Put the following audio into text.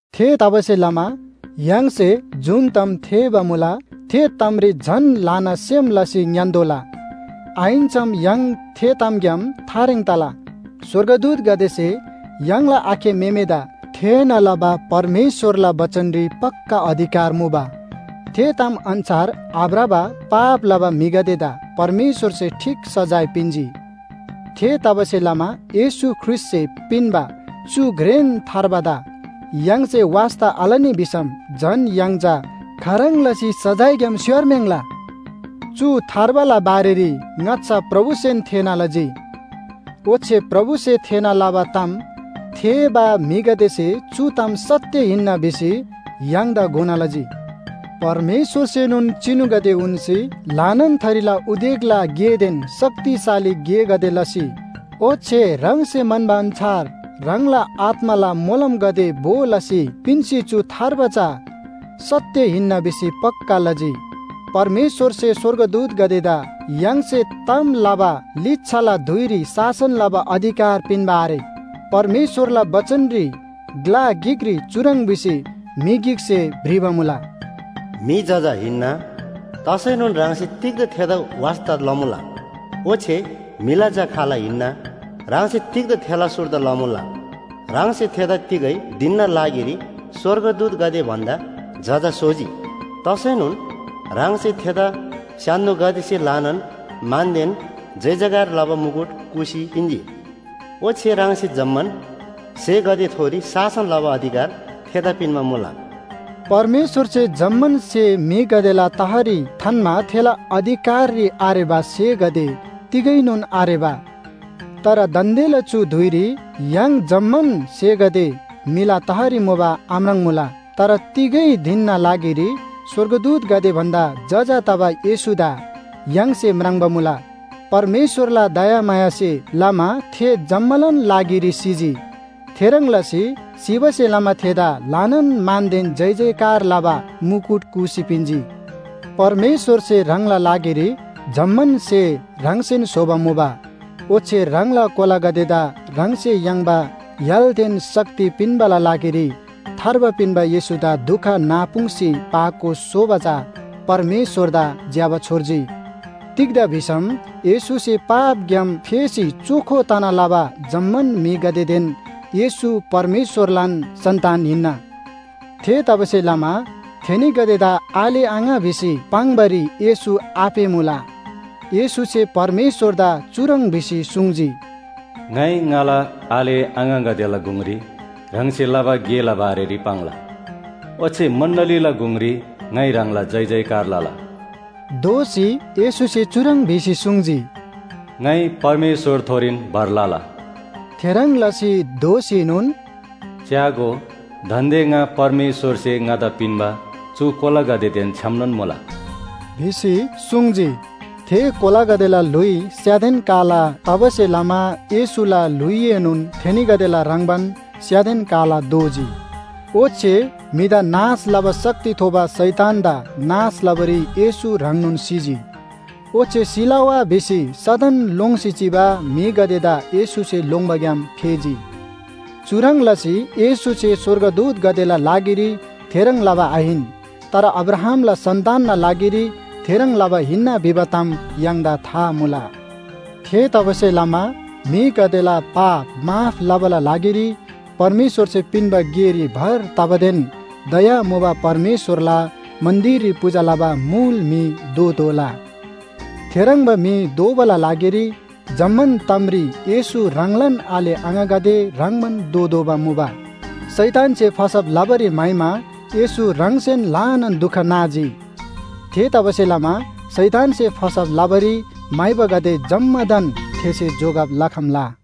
थेतबासेलमा य्‍हाङसे जुन ताम थेःबा मुला थे तामरी झन ल्‍हाना सेम लसी ङ्‌यान्‍तोःला, आहिन्‍सम य्‍हाङ थे तामग्‍याम थारेङ तला। स्‍वर्गदूतगदेसे य्‍हाङला आखे म्‍हेमेदा थेःना लबा परमेश्‍वरला बचनरी पक्‍का अधिकार मुबा। थे ताम अन्‍छार आभ्रबा पाप लबा म्‍हिगदेदा परमेश्‍वरसे ठीक सजाय पिन्‍जी। थेतबासेलमा येशू ख्रीष्‍टसे पिन्‍बा चु घ्रेन थार्बादा य्‍हाङसे वास्‍ता आलनी भिसम झन य्‍हाङ चा खाह्रङ् लसी सजायग्‍याम स्‍योर्म्‍याङ्‌ला? चु थार्बाला बारेरी ङाच्‍छा प्रभुसेन थेःना लजी। ओच्‍छे प्रभुसे थेःना लबा ताम थेःबा म्‍हिगदेसे चु ताम सत्‍य हिन्‍ना भिसी य्‍हाङदा घोना लजी। परमेश्‍वरसेनोन चिनुगदे उन्‍सी, ल्‍हानान थरीला उदेकला गेदेन शक्तिशाली गेगदे लसी, ओच्‍छे ह्राङसे म्‍हन्‍बा अन्‍छार ह्राङला आत्‍माला मोलमगदे भो लसी पिन्‍सी चु थार्बा चा सत्‍य हिन्‍ना भिसी पक्‍का लजी। परमेश्‍वरसे स्‍वर्गदूतगदेदा य्‍हाङसे ताम लबा लिच्‍छाला धुइरी शासन लबा अधिकार पिन्‍बा आरे। परमेश्‍वरला बचनरी ग्‍ला गिकरी चुह्रङ् भिसी म्‍हि गिकसे भ्रिबा मुला, “म्‍हि जजा हिन्‍ना, तसैनोन ह्राङसे तिग्‍दा थेदा वास्‍ता लमुला? ओच्‍छे म्‍हिला झा खाल हिन्‍ना, ह्राङसे तिग्‍दा थेला सुर्दा लमुला? ह्राङसे थेदा तिगै धिनना लागिरी स्‍वर्गदूतगदे भन्‍दा जजा स्‍होजी। तसैनोन ह्राङसे थेदा स्‍य्‍हान्‍दोगदेसे ल्‍हानान मानदेन जयजयकार लबा मुकुट कूसी पिन्‍जी। ओच्‍छे ह्राङसे जम्‍मान स्‍हेगदेथोरी शासन लबा अधिकार थेदा पिन्‍बा मुला।” परमेश्‍वरसे जम्‍मान स्‍हे म्‍हिगदेला तहरी थान्‍मा थेला अधिकाररी आरेबा स्‍हेगदे तिगैनोन आरेबा। तर दान्‍देला चु धुइरी य्‍हाङ जम्‍मान स्‍हेगदे म्‍हिला तहरी मुबा आम्राङ्‌मुला। तर तिगै धिनना लागिरी स्‍वर्गदूतगदे भन्‍दा जजा तबा येशूदा य्‍हाङसे म्राङ्बा मुला। परमेश्‍वरला दयामायासे लमा थे जम्‍मालान लागिरी सिजी। थेह्रङ् लसी सिबासे लमा थेदा ल्‍हानान मानदेन जयजयकार लबा मुकुट कूसी पिन्‍जी। परमेश्‍वरसे ह्राङला लागिरी जम्‍मान स्‍हे ह्राङसेन स्‍होबा मुबा। ओच्‍छे ह्राङला कोलागदेदा ह्राङसे याङ्बा य्‍हालदेन शक्ति पिन्‍बाला लागिरी थार्बा पिन्‍बा येशूदा दुख नापुङ्‌सी पाको स्‍होबा चा परमेश्‍वरदा ज्‍यबा छोर्जी, तिग्‍दा भिसम येशूसे पापग्‍याम फेसी चोखो तना लबा जम्‍मान म्‍हिगदेदेन येशू परमेश्‍वरलान सन्‍तान हिन्‍ना। थेतबासेलमा थेनीगदेदा आले आङा भिसी पाङ्‌बारी येशू आपेःमुला। येशूसे परमेश्‍वरदा चुह्रङ् भिसी सुङ्जी, “ङाइ ङाला आले आङागदेला गुङरी ह्राङसे लबा गेला बारेरी पाङ्ला, ओच्‍छे मण्‍डलीला गुङरी ङाइ ह्राङला जयजयकार लला।” दोःसी येशूसे चुह्रङ् भिसी सुङ्जी, “ङाइ परमेश्‍वरथोरीन भर लला।” थेह्रङ् लसी दोःसीनोन “च्‍यागो, दान्‍दे ङा परमेश्‍वरसे ङादा पिन्‍बा चु कोलागदेदेन छ्‌यामनोन मुला” भिसी सुङ्जी। थे कोलागदेला ल्‍हुइ स्‍यादेन काला तबासे लमा येशूला ल्‍हुइएनोन थेनीगदेला ह्रङ्‌बान स्‍यादेन काला दोजी। ओच्‍छे म्‍हिदा नाश लबा शक्ति थोबा शैतानदा नाश लबारी येशू ह्राङनोन सिजी। ओच्‍छे सिला वा भिसी सदन लोङ्सी चिबा म्‍हिगदेदा येशूसे लोङ्बाग्‍याम फेजी। चुह्रङ् लसी येशूसे स्‍वर्गदूतगदेला लागिरी थेह्रङ् लबा आहिन, तर अब्राहामला सन्‍तानना लागिरी थेह्रङ् लबा हिन्‍ना भिबा ताम य्‍हाङदा था मुला। थेतबासेलमा म्‍हिगदेला पाप माफ लबाला लागिरी परमेश्‍वरसे पिन्‍बा गेरी भर तबादेन दया मुबा परमेश्‍वरला मन्‍दिररी पूजा लबा मुल म्‍हि दोतोःला। थेह्रङ्बा म्‍हि दोबाला लागिरी जम्‍मान तामरी येशू ह्राङलान आले आङागदे ह्रङ्‌बान दोतोःबा मुबा। शैतानसे फसब लबारी म्‍हाइमा येशू ह्राङसेन ल्‍हानान दुख नाजी। थेतबासेलमा शैतानसे फसब लबारी म्‍हाइबागदे जम्‍मादान थेसे जोगब लखम्‍ला।